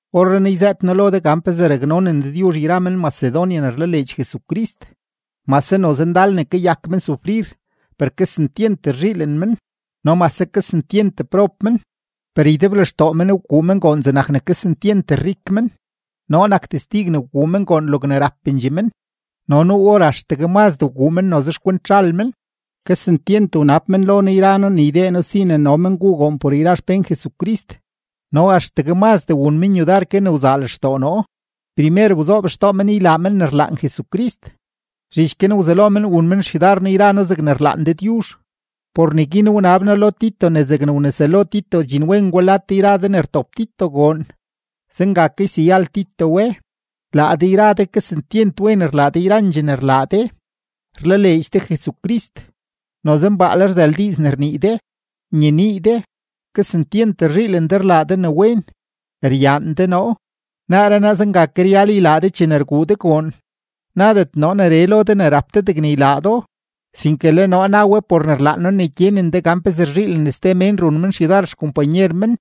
Orrenaa yzëët noo lo de gan pezee raknonen Dëdyuzh yra men-Macedonia ne rlaleedx Jesucrist. Mase noze ndal ne kayak men sufrir, per kesentyent rzhiilen men; no mase kesentyent prob men, per ydeblextoo men wguu men goon zegnak ne kesentyent rik men. Noo nak testig ne wguu men goon logne rapendxee men, no nuu or axtegue mazdee wguu men noze xkwent zhal men. Kesentyent wnab men lo noo yra noo ne ydee noo si ne no men guu goon por yra xpén Jesucrist. No axtegue mazdee wun men yudar ke ne wzaa lextoo noo. Primer wzoob xtoo men ylaa men ne rlaan Jesucrist, zhich guin wzelo men wun men xyudar noo yra noo zegne rlaan Dëdyuzh. Por neguin wnab noo lo Tito ne zegne wneselo Tito dxinwen gwa lad de yra de ne rtop Tito goon, zenga ke yseyal Tito we. Laa de yra de kesentyent wen rlaa de yrandxee ne rlaa de: rlaleedx de Jesucrist, noze mbaale rzël diiz ne rnii de, nyenii de, kesentyent rzhiilen de rlaa de ne wen, ryaan de noo; naaree naa zenga ke ryal ylaa de chene rguu de goon. Nadet noo neree lo de ne rap de degne ylaa do, sinke le noo na we por ne rlaan noo ne gyenen de gan pezee rzhiilen ste mén run men xyudar xkompanyer men,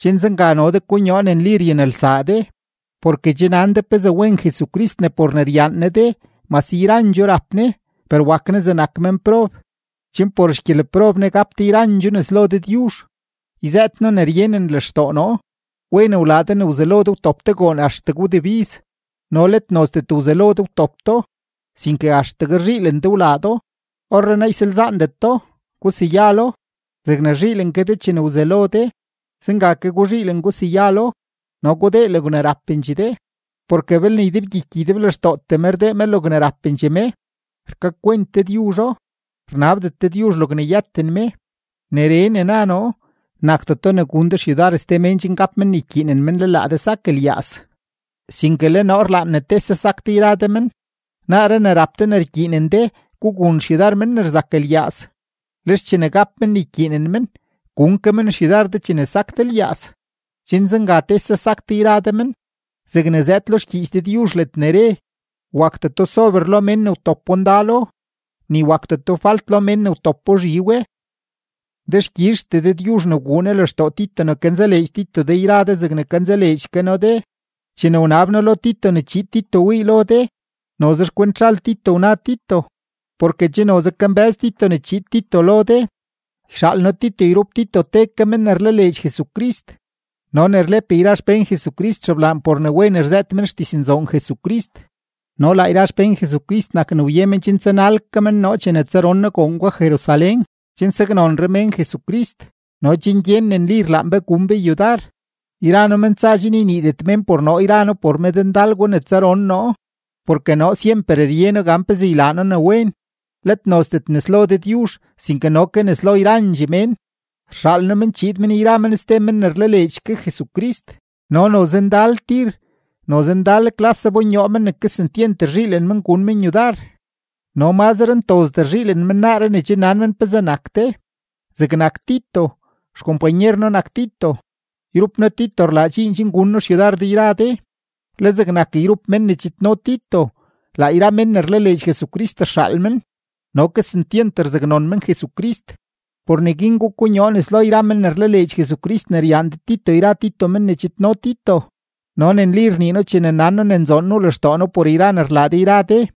chen zenga no de konyoo ne nli ryanelsaa de. Porke che nan de pezee wen Jesucrist ne por ne ryaan Ne de, mase yrandxoo rap Ne, per wak Ne zegnak menprob, chen por xgyeleprob Ne gap de yrandxoo nes lo Dëdyuzh. Yzëët noo ne ryenen lextoo noo: Wen wlaa de ne wzelo de wtop de goon axtegue wdebiz, no let nozdet wzelo de wtop do, sinke axtegue rzhiilen de wlaa do. Orrenaa ysalzaandet do, guseyalo; zegne rzhiilen ke de chene wzelo de, zenga ke guzhiilen guseyalo, no gudee logne rapendxee de. Porke belne ydebgyiky ydeblextootee me rdee me logne rapendxee me, rkakwent Dëdyuzho; rnabdet Dëdyuzh logne yëten me. Neree ne na noo, nakdeto ne gun de xyudar ste mén chen gap men ne ykyiinen men le laa de sak lyaaz; sinke le noo rlaan ne tese sak de yra de men. Naaree ne rap de ne rkyiinen de, gugun xyudar men ne rzak lyaaz, lex chene gap men ne ykyiinen men, gun ke men xyudar de chene sak de lyaaz, chen zenga tese sak de yra de men, zegne zëëd lo xgyiich Dëdyuzh ledne re: “Wakdeto sober lo mén ne wtopo ndalo, ni wakdeto falt lo mén ne wtopo zhi we.” Dexkyizhtee Dëdyuzh ne wguu Ne lextoo Tito ne kanzaleedx Tito de yra de zegne kanzaleedx ke noo de. Chene wnab noo lo Tito ne chiid Tito wii lo de, noze xkwent zhal Tito wna Tito, porke che noze kambë́z Tito ne chiid Tito lo de. Yxaal noo Tito yrup Tito te ke men ne rlaleedx Jesucrist no ne rlep yra xpén Jesucrist xeblaan por ne wen rzëët men xdiznzoon Jesucrist. No laa yra xpén Jesucrist nak ne wye men chen tsanal ke men noo chene tsaron noo goon gwa Jerusalén chen saknonre mén Jesucrist no chen gyen ne nli rlaan be gun be yudar. Yra noo men tsa chen yniidet mén por noo yra noo por medndal gwa ne tsaron noo. Porke noo syemper rye noo gan pezee ylaa noo ne wen, let nozdet nes lo Dëdyuzh, sinke no ke nes lo yrandxee mén. Rxaal noo men chiid men yra men ste men ne rlaleedx ke Jesucrist, no noze ndal tir, noze ndal klas zabonyoo men ne kesentyent rzhiilen men gun men yudar, no mazre ntozdee rzhiilen men naaree ne che nan men pezee nak de. Zegnak Tito, xkompanyer noo nak Tito, yrup noo Tito rlaa dxiin chen gun noo xyudar de yra de; le zegnak yrup men ne chidno Tito, laa yra mén ne rlaleedx Jesucrist rxaal men, no kesentyent rzaknon men Jesucrist. Por neguin gukonyoo nes lo yra men ne rlaleedx Jesucrist ne ryaan de Tito yra Tito men ne chidno Tito no ne nli rnii noo chene nan noo ne nzoon nuu lextoo noo por yra ne rlaa de yra de.